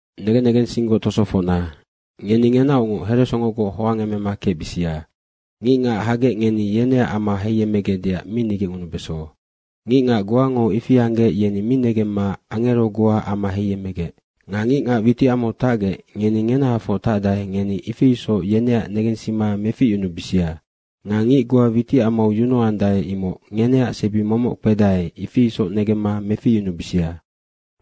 Negen negensinggoc tosofocna, ngeni ngenaocngoc heresongogoc hoangemema kecbisia. Ngicngac hagec ngeni yeneac ama heiyemmegecdeac mi nigecngunubeso. Ngicngac goango ifi anggec, yeni mi negemma angero goa ama heiyemmegec. Nga ngicngac witicamau tacgec ngeni ngenahafoc tacdae, ngeni ifi isoc yeneac negensima meficyunubisia. Nga ngic goa witicamau yunuandae, imoc ngeneac sebi momoc kpedae, ifi isoc negemma meficyunubisia.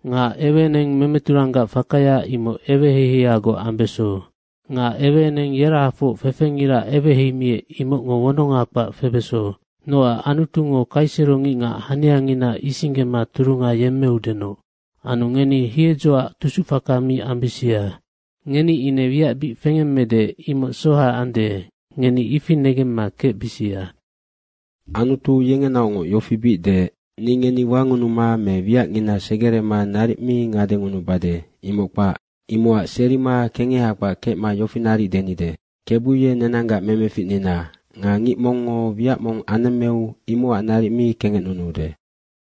Nga eweeneng memeturanggac fakaya imoc eweheiheiagoc ambeso. Nga eweeneng yerahafoc fefengira eweheimiec imocngo wononga kpac febeso. Noac, Anutungo kaisero ngicngac haniangina isinggema turunga yemmeudenoc. Anu ngeni hiedzoac tusuc faka mi ambisia, ngeni ine wiac bic fengemmede, imoc soha ande, ngeni ifi negemma kecbisia. Anutu yengenaocngoc yofi bic deec, “Ni ngeni wangunuma me wiacngina segerema naric mi ngadengunubade, imoc kpac.” Imocac serima kengeha kpac kecma yofi naric denide, “KEBU ye nenanggac memeficnina nga ngic mongngo wiac mong anemmeu imocac naric mi kengecnunuude.”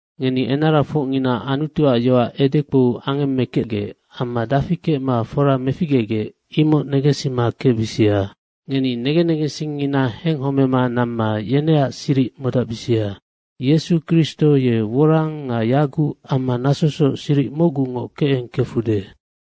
Ngeni enarafocngina Anutuac yoac edekpou angemmekecgec amma dafi kecma fora meficgegec, imoc negensima kecbisia. Ngeni negen negensingngina henghomema namma yeneac siric modacbisia. Yesu Kristo ye worang nga yaguc amma nasosoc siric mocgungoc kecengkefude.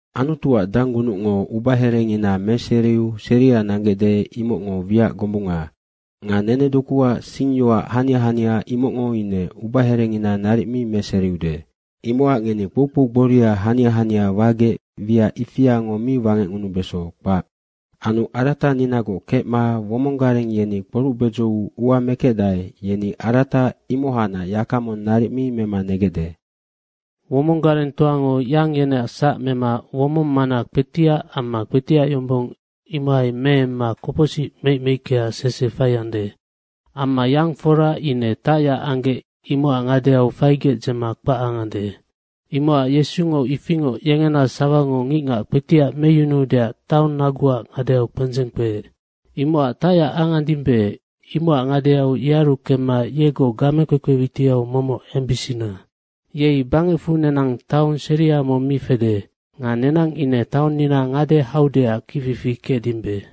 Anutuac danggunucngo ubaherengina meseriu seria nanggecde, imocngo wiac gombunga. Nga nenedokuac singyoac hania hania imocngo ine ubaherengina naric mi meseriude. Imocac ngeni kpoukpou gboria hania hania wagec wiac ifiango mi wangecngunubeso, kpac. Anu arataninagoc kecma womong gareng yeni kporuc bedzou ua mekecdae, yeni arata imohacnac yaka mong naric mi mema negecde. Womong garengtoango yang yeneac sac mema womong mana kpetiac amma kpetiac yombong, imohai meemma kopocsic meic meickeac sese faiande. Amma yang fora ine tacyac anggec imocac ngadeau faigec dzema kpac angande. Imocac Yesungo ifingoc yengena sawango ngicngac kpetiac meyunuudeac taong naguac ngadeau kpendzeng kpeec. Imocac tacyac angandimbe, imocac ngadeau yearu kemma yegoc gamekpekpe witiau momoc embisina. Yei bangecfu nenang taong seria mong mi fede. Nga nenang ine taonnina ngade haudeac kicfifi kecdimbe.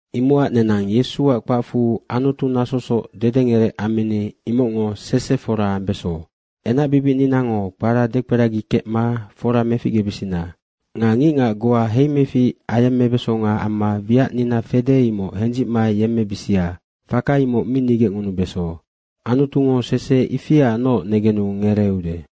Imocac nenang Yesuac kpacfu Anutu nasosoc dedengerec ammini, imocngo sese fora ambeso. Enacbibicninango kpara dekperagikecma fora meficgebisina. Nga ngicngac goa heimefic ayemmebesonga amma wiacnina fede, imoc hendzicma yemmebisia, faka imoc mi nigecngunubeso. Anutungo sese ifiaacnoc negenu ngereeude.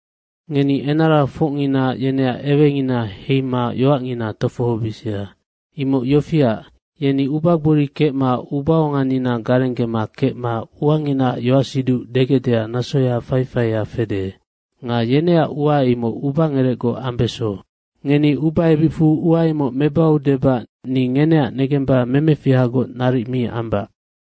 Ngeni enarafocngina yeneac ewengina heima yoacngina tofohobisia. Imoc yofiac, yeni ubagbori kecma ubaonganina garenggema kecma uanginaac yoacsiduc degecdeac nasoya faifaia fede. Nga yeneac ua imoc ubangerecgoc ambeso. Ngeni ubaebicfu ua imoc mebau debac ni ngeneac negemba memefihagoc naric mi ambac.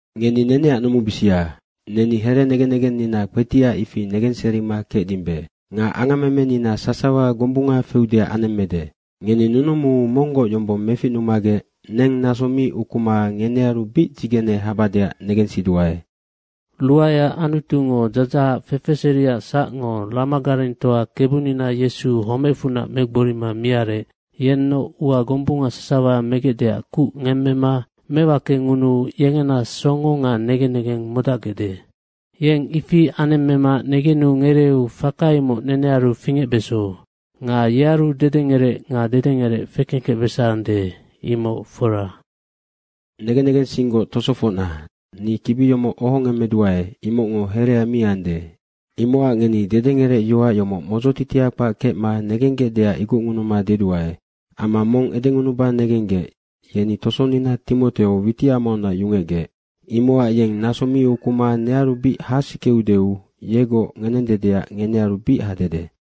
Ngeni neneac numubisia. Neni herenegen negennina kpetiac, ifi negenserima kecdimbe. Nga angammemenina sasawa gombunga feudeac anemmede. Ngeni nunumuu monggoc yombong meficnumagec neng naso mi ukuma ngenearu bic dzigene habadeac negensiduae. Ruaeac Anutungo dzadzahac fefeseriac sacngo, ramagarengtoa Kebunina Yesu homecfunac megborima miarec, yennoc ua gombunga sasawa megecdeac kuc ngemmema mewakengunuu yengena songo nga negen negeng modacgecde. Yeng ifi anemmema negenu ngereeu, faka imoc nenearu fingecbeso. Nga yearu dedengerec nga dedengerec fekengkecbesande, imoc fora. Negen negensinggoc tosofocna, ni kibi yomoc ohongemmeduae, imocngo herea mi ande, imocac ngeni dederecge yoac yomoc modzotitia kpac kecma negenggecdeac igocngunuma deduae. Amma mong edengunuba negenggec, yeni tosonina Timoteo witicamaunac yungecgec. Imocac yeng naso mi ukuma nearu bic hasikeudeu yegoc ngenendedeac ngenearu bic hadede.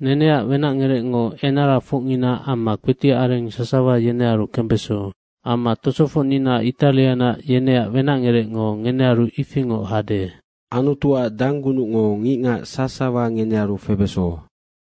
Neneac wenacngerecngo enarafocngina amma kpetiac areng sasawa yenearu kembeso. Amma tosofocnina Itarianac yeneac wenacngerecngo ngenearu ifingoc hade. Anutuac danggunucngo ngicngac sasawa ngenearu febeso.